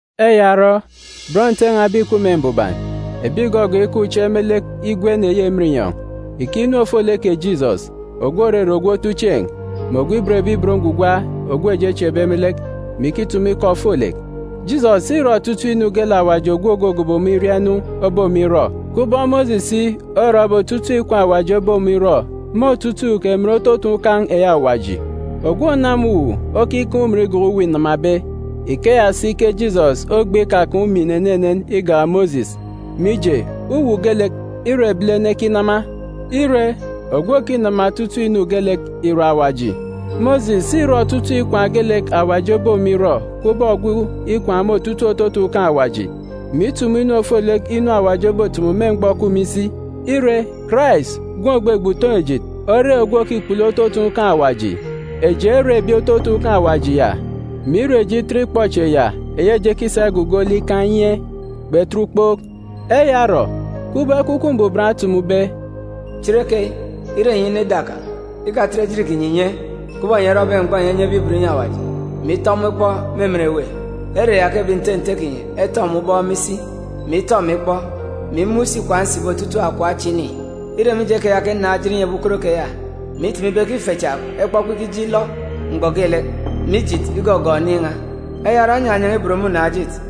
Eya orọ, bọn Nte n̄a ebi ìkup me mbuban, ebi ìgọgọọk ikaan̄ uche me lek igwen eyi emen inyọn̄, ìkeek inu ofolek kè Jisọs, ogwu òrere ogwu otuchieen̄, mè ogwu òban Awaji ogwu eji echieekbe me lek, mè ikitumu ikọ ofolek. Jisọs îrọ otutuuk inu geelek Awaji ogwu ògogobo ọmọ iria inu obe ọmọ irọ, kubọk Mosis si orọbe otutuuk ikwaan̄ Awaji obe ọmọ irọ me otutuuk emen ototun̄ ukan̄ eyi Awaji. Ogwu ònama uwu okikaan̄ umin igak uwu înamabe. Ikeya si ke Jisọs ogbe ikakaan̄ umin enenen igak Mosis. Mije, uwu geelek, îre ebilene ekinama. Ire, ogwu òkinama otutuuk inu geelek ìre Awaji. Mosis îrọ otutuuk ikwaan̄ geelek Awaji obe ọmọ irọ kubọk ogwu ikwaan̄ me otutuuk ototun̄ ukan̄ Awaji, mè itumu inu ofolek inu Awaji obotumu me mgbọ òkup me isi. Ire, Karais, Gwun̄ ògbegbe utoon̄-ejit, ore ogwu òkikpulu ototun̄ ukan̄ Awaji. Eji ere ebi ototun̄ ukan̄ Awaji ya, mè ire eji itet ikpọchieen̄ ya eyi eji ekisa igugo lek ikaan̄ inye, kpetet ukpook. Eya orọ, kubọk Ekwukwu Mbuban otumube, “Chereyi, ire enyi inọ ida kan̄, ikatet ejit kinyi ìnye, kubọk enyi erọbe mgbọ enyi enyebe ibot inyi Awaji, mè itọ ọmọ ikpọ me emen èwê. Ere ya ke ebi nte nte kinyi etọ emi ubọk me isi, mè itọ emi ikpọ, mè imun̄ si ikwaan̄ nsibe otutuuk akọp acha ini. Îre mije keya ke nnaan̄ ejit inyi ebi ukot keya, mè itumu ibe ke ife cha ekpọkpọ ikije ilọ mgbọ geelek, mè ijit igọgọọk oniin̄ n̄a. Eya orọ, nnyanyan̄a ibot me unaan̄-ejit,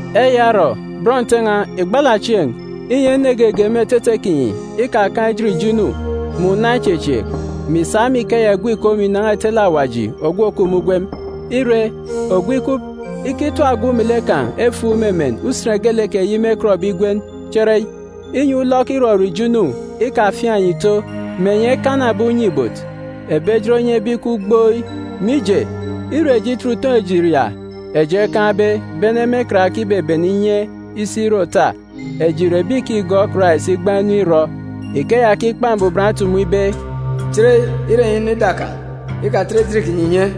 Eya orọ, bọn nte n̄a, ìgbala chieen̄, inyi ene geege me etete kinyi ikakaan̄ ejit ijo inu, mè una ichechieek, mè ìsa me ikeya ìgwu ìkom ìnan̄a ìtele Awaji ogwu òkup me ugwem. Ire, ogwu ikup, ikitap ogwu melek kan̄ efuuk me emen usen geelek eyi mêkọtbe igwen “Chereyi,” inyi ulọk irọrọ ijo inu ikafiaan̄ enyi ìto, mè enyi ekana ebi unye-ibot, ebi ejit onyebe ikup gboi. Mije, ire eji itet utoon̄-ejit ya eji ekaan̄be bene me karake ibebene inye isi ire òta, eji ìre ebi ìkigọọk Karais igbaan̄ inu irọ. Ikeya ke Ikpa Mbuban otumu ibe, “Chereyi, ire enyi inọ ida kan̄, ikatet ejit kinyi ìnye,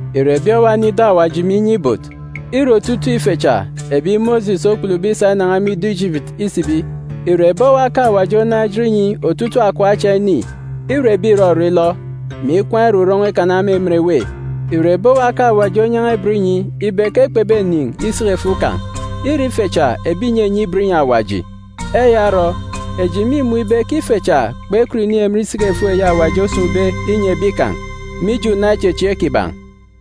Ìre ebi owa enọ ida Awaji, mè inye ibot? Îre otutuuk ife cha ebi Mosis okpulube isa inan̄a me ido Ijipiti isibi. Ìre ebi owa ke Awaji onaan̄ ejit inyi otutuuk akọp acha ini? Îre ebi ìrọrọ ilọ, mè ikwaan̄ irurọn̄ọ ikana me emen èwê. Ìre ebi owa ke Awaji onyan̄a ibot inyi ibe ke kpebenin̄ isiki-efuuk kan̄? Îre ife cha ebi ìnyenye ibot inyi Awaji. Eya orọ, eji mîmun̄ ibe ke ife cha kpekọt inin̄ emen isiki-efuuk eyi Awaji osun̄be inyi ebi kan̄, mije una ichechieek kiban̄.